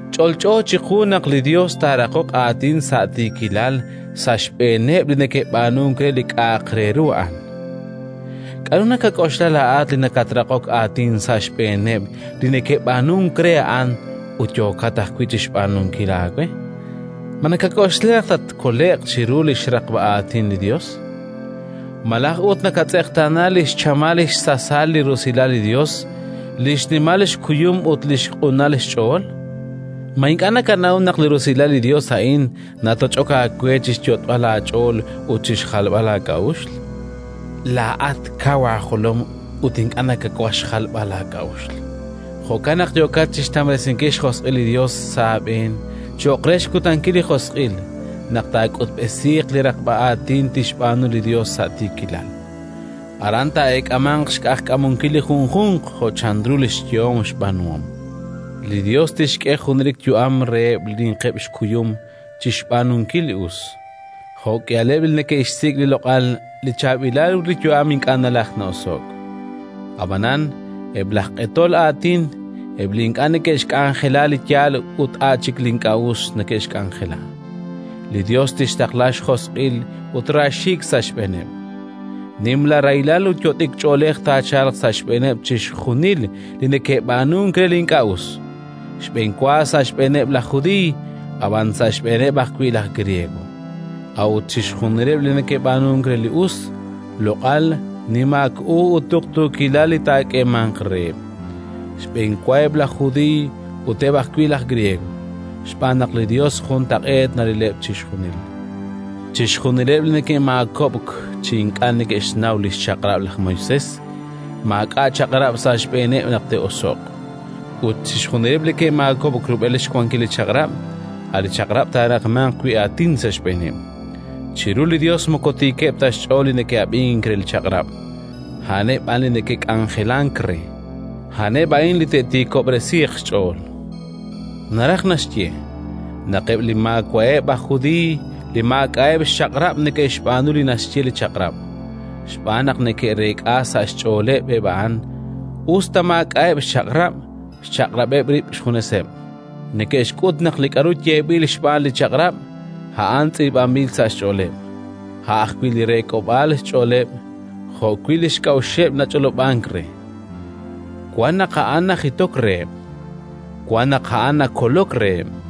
Ch'olch'o chiqu naq li Yos taaraqoq aatin sa' tiikilal sa' xb'eeneb' li neke'b'aanunk re li k'a'aq re ru a'an. K'aru nakak'oxla laa'at li nakatraqok aatin sa' xb'eeneb' li neke'b'aanunk re a'an ut yookat ajwi' chi xb'aanunkil aawe? Ma nakak'oxla naq tatkole'q chiru li xraqb'a aatin li Yos? Malaj ut nakatz'eqtaana li xchamal xsasal li rusilal li Yos, li xnimal xkuyum ut li xq'unal xch'ool? Ma ink'a' nakanaw naq li rusilal li Yos a'in natoch'ok aawe chi xyot'b'al laach'ool ut chi xjalb'al laak'a'uxl? Laa'at kaw laajolom ut ink'a' nakawaj xjalb'al laak'a'uxl; jo'kan naq yookat chi xtamresinkil xjosq'il li Yos sa' aab'een cho'q re xkutankil li Josq'il naq taak'utb'esiiq li raqb'a aatin tixb'aanu li Yos sa' tiikilal. Aran taak'eemanq xq'ajkamunkil li junjunq jo' chanru li xyehom xb'aanuhom: li Yos tixk'e junelik yu'am reheb' li ninqeb' xkuyum chi xb'aanunkil li us, jo'k'ihaleb' li neke'xsik' li loq'al, li chaab'ilal ut li yu'am ink'a' nalajk na'oso'k. Ab'anan eb' laj q'etol aatin, eb' li ink'a' neke'xk'anjela li yaal ut a' chik li ink'a' us neke'xk'anjela, li Yos tixtaqla xjosq'il ut raaxiik' sa' xb'eeneb'. Nimla rahilal ut yot'ik ch'oolej taachalq sa' xb'eeneb' chixjunil li neke'b'aanunk re li ink'a' us: xb'enwa sa' xb'eeneb' laj Judiiy, ab'an sa' xb'eeneb' ajwi' laj Griego. A'ut chixjunileb' li neke'b'aanunk re li us: loq'al, nimaak u ut tuqtuukilal li taak'eemanq reheb'; xb'enwa eb' laj Judiiy, ut eb' ajwi' laj Griego. Xb'aan naq li Yos juntaq'eet narileb' chixjunil. Chixjunileb' li ke'maakob'k chi ink'a' ke'xnaw li xChaq'rab' laj Moisés, maak'a' Chaq'rab' sa' xb'eeneb' naq te'oso'q; ut chixjunileb' li ke'maakob'k rub'el xwankil li Chaq'rab', a' li Chaq'rab' taaraqmanq wi' aatin sa' xb'eeneb'. Chiru li Yos moko tiikeb' ta xch'ool li neke'ab'ink re li Chaq'rab', a'aneb' b'an li neke'k'anjelank re: a'aneb' a'in li te'tiikob'resiiq xch'ool. Naraj naxye: naq eb' li maawa'eb' aj Judiiy li maak'a'eb' xChaq'rab' neke'xb'aanu li naxye li Chaq'rab' xb'aan naq neke'reek'a sa' xch'ooleb', eb' a'an, us ta maak'a'eb' xChaq'rab', xchaq'rab'eb' rib' xjuneseb'. Neke'xk'ut naq li k'aru yeeb'il xb'aan li Chaq'rab', a'an tz'iib'anb'il sa' xch'ooleb'. A' ajwi' li reek'ob'aal xch'ooleb' jo'wi' li xk'a'uxeb' nach'olob'ank re: wan naq a'an najitok reheb', wan naq a'an nakolok reheb'.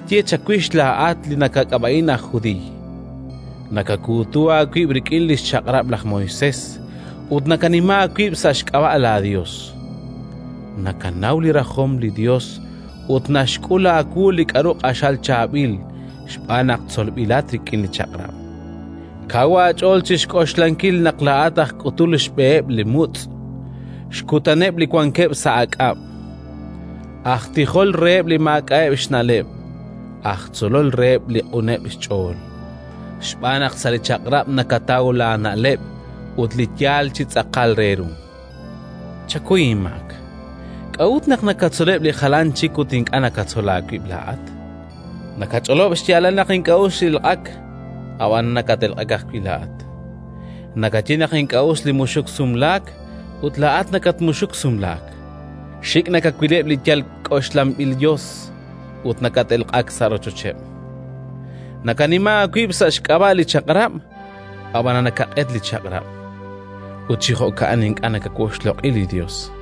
Ab'anan k'aru tqaye chawix laa'at li nakak'ab'a'in aj judiiy? Nakakuutu aawib' rik'in li xChaq'rab' laj Moisés ut nakanima aawib' sa' xk'ab'a' laaYos. Nakanaw li rajom li Yos ut naxk'ul aawu li k'aru q'axal chaab'il xb'aan naq tzolb'ilat rik'in li Chaq'rab'. Kaw aach'ool chi xk'oxlankil naq laa'at aj k'utul xb'eheb' li mutz', xkutaneb' li wankeb' sa' aak'ab', aj tijol reheb' li maak'a'eb' xna'leb' ut aj tzolol reheb' li q'uneb' xch'ool, xb'aan naq sa' li Chaq'rab' nakataw laana'leb' ut li yaal chi tz'aqal re ru. Chakuy inmaak, k'a'ut naq nakatzoleb' li jalan chik ut ink'a' nakatzol aawib' laa'at? Nakach'olob' xyaalal naq ink'a' us li elq'ak, ab'anan nakat-elq'ak ajwi' laa'at. Nakaye naq ink'a' us li muxuk sumlaak, ut laa'at nakatmuxuk sumlaak. Xik' nakawileb' li yal k'oxlanb'il yos, ut nakat-elq'ak sa' rochocheb'. Nakanima aawib' sa' xk'ab'a' li Chaq'rab', ab'anan nakaq'et li Chaq'rab'; ut chi jo'kan ink'a' nakawoxloq'i li Yos.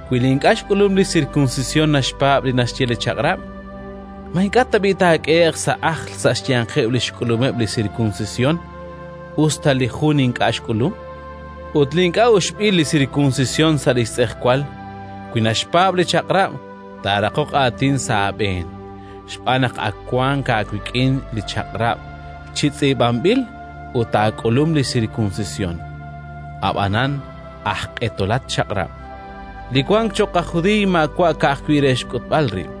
Wi li ink'a' xk'ulum li sirkunsisyon naxpaab' li naxye li Chaq'rab', ma ink'a' tab'i' taak'ehe'q sa' ajl sa' xyanqeb' li xk'ulumeb' li sirkunsisyon, us ta li jun ink'a' xk'ulum? Ut li ink'a' uxb'il li sirkunsisyon sa' li xtz'ejwal, wi naxpaab' li Chaq'rab', taaraqoq aatin sa' aab'een, xb'aan naq wank aawik'in li Chaq'rab' chi tz'iib'anb'il ut aak'ulum li sirkunsisyon, ab'anan aj q'etolat Chaq'rab'. Li wank cho'q aj judiiy maawa' ka'ajwi' re xk'utb'al rib';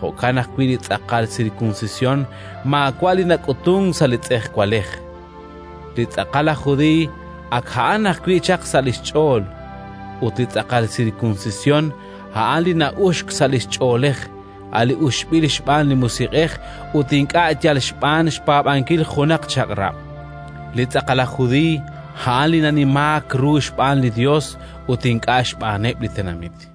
jo'kan ajwi' li tz'aqal sirkunsisyon maawa' li nak'utunk sa' li tz'ejwalej. Li tz'aqal aj judiiy ak a'an ajwi' chaq sa' li xch'ool, ut li tz'aqal sirkunsisyon a'an li na'uxk sa' li ch'oolej, a' li uxb'il xb'aan li Musiq'ej ut ink'a' yal xb'aan xpaab'ankil junaq chaq'rab'. Li tz'aqal aj judiiy a'an li nanimaak ru xb'aan li Yos ut ink'a' xb'aaneb' li tenamit.